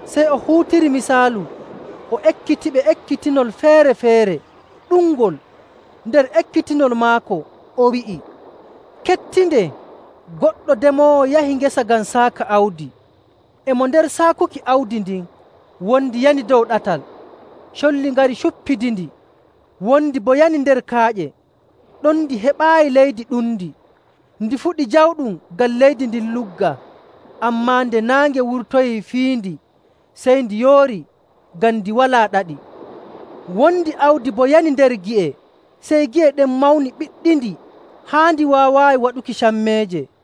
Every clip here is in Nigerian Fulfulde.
Sey o huutiri misaalu o ekkitiɓe ekkitinol feere‑feere ɗuɗngol. Nder ekkitinol maako o wi'i, “Kettindee! Goɗɗo demoowo yahi ngesa ngam saaka awdi. E mo nder saakuki awdi ndin, wondi yani dow ɗatal, colli ngari cuppidindi. Wondi boo yani nder kaaƴe; ɗon ndi heɓaayi leydi ɗundi. Ndi fuɗi jawɗum ngam leydi ndin luggaa. Ammaa nde naange wurtoyii fiyindi, sey ndi yoori ngam ndi walaa ɗaɗi. Wondi awdi boo yani nder gi'e, sey gi'e ɗen mawni ɓiɗɗindi haa ndi waawaayi waɗuki cammeeje.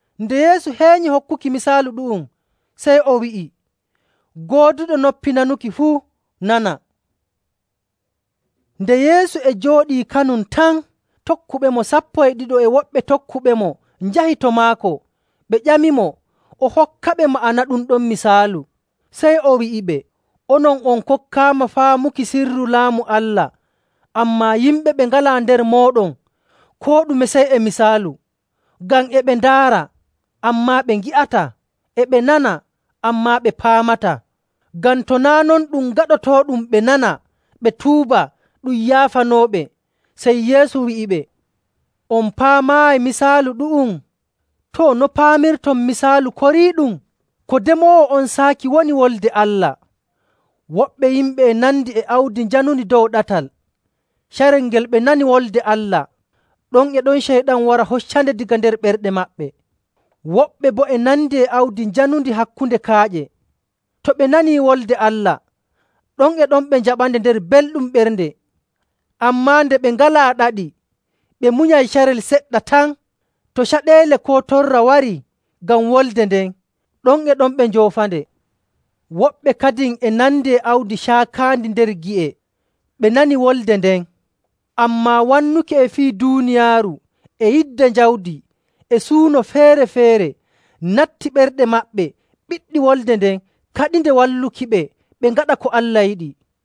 Nde Yeesu heenyi hokkuki misaalu ɗu'um, sey o wi'i, “Gooduɗo noppi nanuki fuu nana.” Nde Yeesu e jooɗii kanum tan, tokkuɓemo sappo e ɗiɗo e woɓɓe tokkuɓemo njahi to maako ɓe ƴamimo o hokkaɓe ma'ana ɗum ɗon misaalu. Sey o wi'iɓe, “Onon on kokkaama faamuki sirru Laamu Allah, ammaa yimɓe ɓe ngalaa nder mooɗon, koo ɗume sey e misaalu, ngam, ‘E ɓe ndaara, ammaa ɓe ngi'ataa. E ɓe nana, ammaa ɓe paamataa. Ngam to naa' non ɗum gaɗotooɗum ɓe nana, ɓe tuuba, ɗum yaafanooɓe.’”. Sey Yeesu wi'iɓe, “On paamaayi misaalu ɗu'um? Too, no paamirton misaalu koriiɗum? Ko demoowo on saaki woni Wolde Allah. Woɓɓe yimɓe e nandi e awdi njanundi dow ɗatal. Carel ngel ɓe nani Wolde Allah, ɗon e ɗon Ceyɗan wara hoccande daga nder ɓerɗe maɓɓe. Woɓɓe boo e nandi e awdi njanundi hakkunde kaaƴe. To ɓe nanii Wolde Allah, ɗon e ɗon ɓe njaɓande nder belɗum ɓernde. Ammaa nde ɓe ngalaa ɗaɗi, ɓe munyay carel seɗɗa tan. To caɗeele koo torra warii ngam wolde nden, ɗon e ɗon ɓe njoofande. Woɓɓe kadin e nandi e awdi caakaandi nder gi'e. Ɓe nani Wolde nden, ammaa wannuki e fii duuniyaaru, e yidde jawdi, e suuno feere‑feere natti ɓerɗe maɓɓe ɓiɗɗi wolde nden kaɗinde wallukiɓe ɓe ngaɗa ko Allah yiɗi.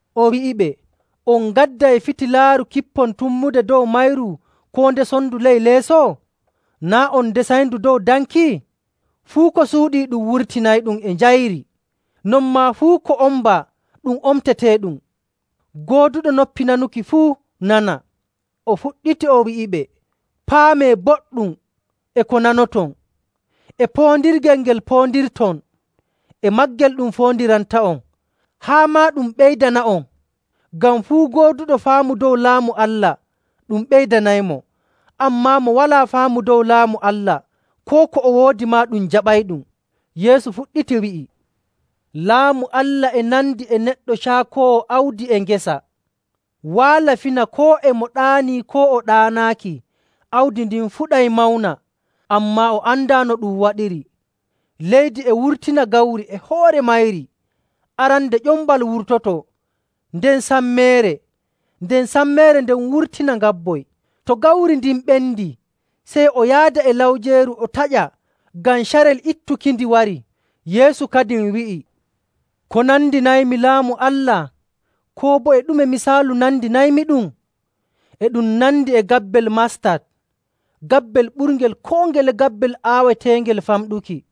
O wi'iɓe, “On ngadday fitilaaru kippon tummude dow mayru, koo ndesonndu ley leeso? Naa' on ndesayndu dow danki?. Fuu ko suuɗii, ɗum wurtinayɗum e njayri, non maa fuu ko ombaa ɗum omteteeɗum.. Gooduɗo noppi nanuki fuu nana.” O fuɗɗiti o wi'iɓe, “Paamee boɗɗum e ko nanoton! E poondirgel ngel poondirton, e maagel ɗum foondiranta'on haa maa ɗum ɓeydana'on.. Ngam fuu gooduɗo faamu dow Laamu Allah ɗum ɓeydanaymo. Ammaa mo walaa faamu dow Laamu Allah, koo ko o woodi maa ɗum jaɓayɗum.”. Yeesu fuɗɗiti wi'i, “Laamu Allah e nandi e neɗɗo caakoowo awdi e ngesa. Waala fina, koo e mo ɗaanii koo o ɗaanaaki, awdi ndin fuɗay mawna, ammaa o andaa no ɗum waɗiri. Leydi e wurtina gawri e hoore mayri. Arande ƴombal wurtoto, nden sammeere, nden sammeere nden wurtina ngabboy. To gawri ndin ɓendii, sey o yaada e lawjeeru o taƴa, ngam carel ittukindi warii.”. Yeesu kadin wi'i, “Ko nandinaymi Laamu Allah? Koo boo e ɗume misaalu nandinaymiɗum? E ɗum nandi e gabbel mastat, gabbel ɓurngel koo ngele gabbel aaweteengel famɗuki.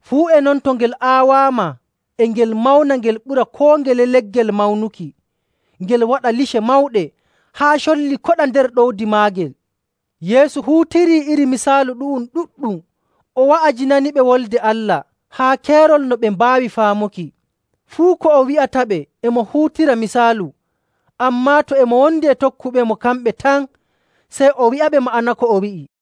Fuu e non to ngel aawaama, e ngel mawna ngel ɓura koo ngele leggel mawnuki, ngel waɗa lice mawɗe haa colli koɗa nder ɗowdi maagel.” Yeesu huutirii iri misaalu ɗu'um ɗuɗɗum, o wa'ajinaniɓe Wolde Allah haa keerol no ɓe mbaawi faamuki. Fuu ko o wi'ataɓe e mo huutira misaalu. Ammaa to e mo wondi e tokkuɓemo kamɓe tan, sey o wi'aɓe ma'ana ko o wi'i.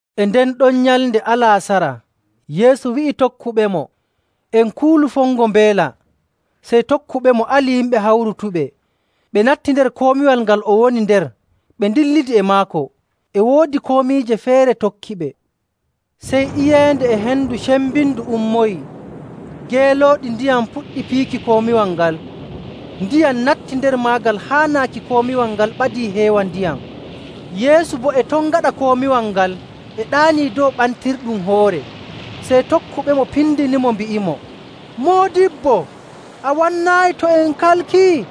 E nden ɗon nyalnde alaasara Yeesu wi'i tokkuɓemo, “En kuulu fongo mbeela.” Sey tokkuɓemo ali yimɓe hawrutuɓe, ɓe natti nder komiwal ngal o woni nder, ɓe ndillidi e maako. E woodi komiije feere tokkiɓe. Sey iyeende e hendu cembindu ummoyii, geelooɗi ndiyam puɗɗi piiki komiwal ngal, ndiyam natti nder maagal haa naaki komiwal ngal ɓadii heewa ndiyam. Yeesu boo e ton gaɗa komiwal ngal e ɗaanii dow ɓantirɗum hoore. Sey tokkuɓemo pindinimo mbi'imo, “Moodibbo, a wannaayi to en kalkii?”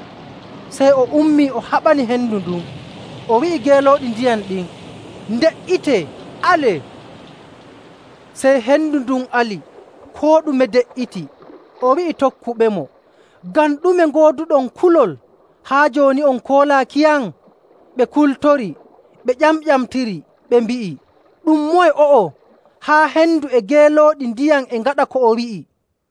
Sey o ummii, o haɓani hendu ndun, o wi'i geelooɗi ndiyam ɗin, “Nde''itee! Alee!” Sey hendu ndun ali, koo ɗume de''iti. O wi'i tokkuɓemo, “Ngam ɗume ngooduɗon kulol? Haa jooni on koolaakiyam?” Ɓe kultori, ɓe ƴamƴamtiri, ɓe mbi'i, “Ɗum moye o'o? Haa hendu e geelooɗi ndiyam e ngaɗa ko o wi'i!”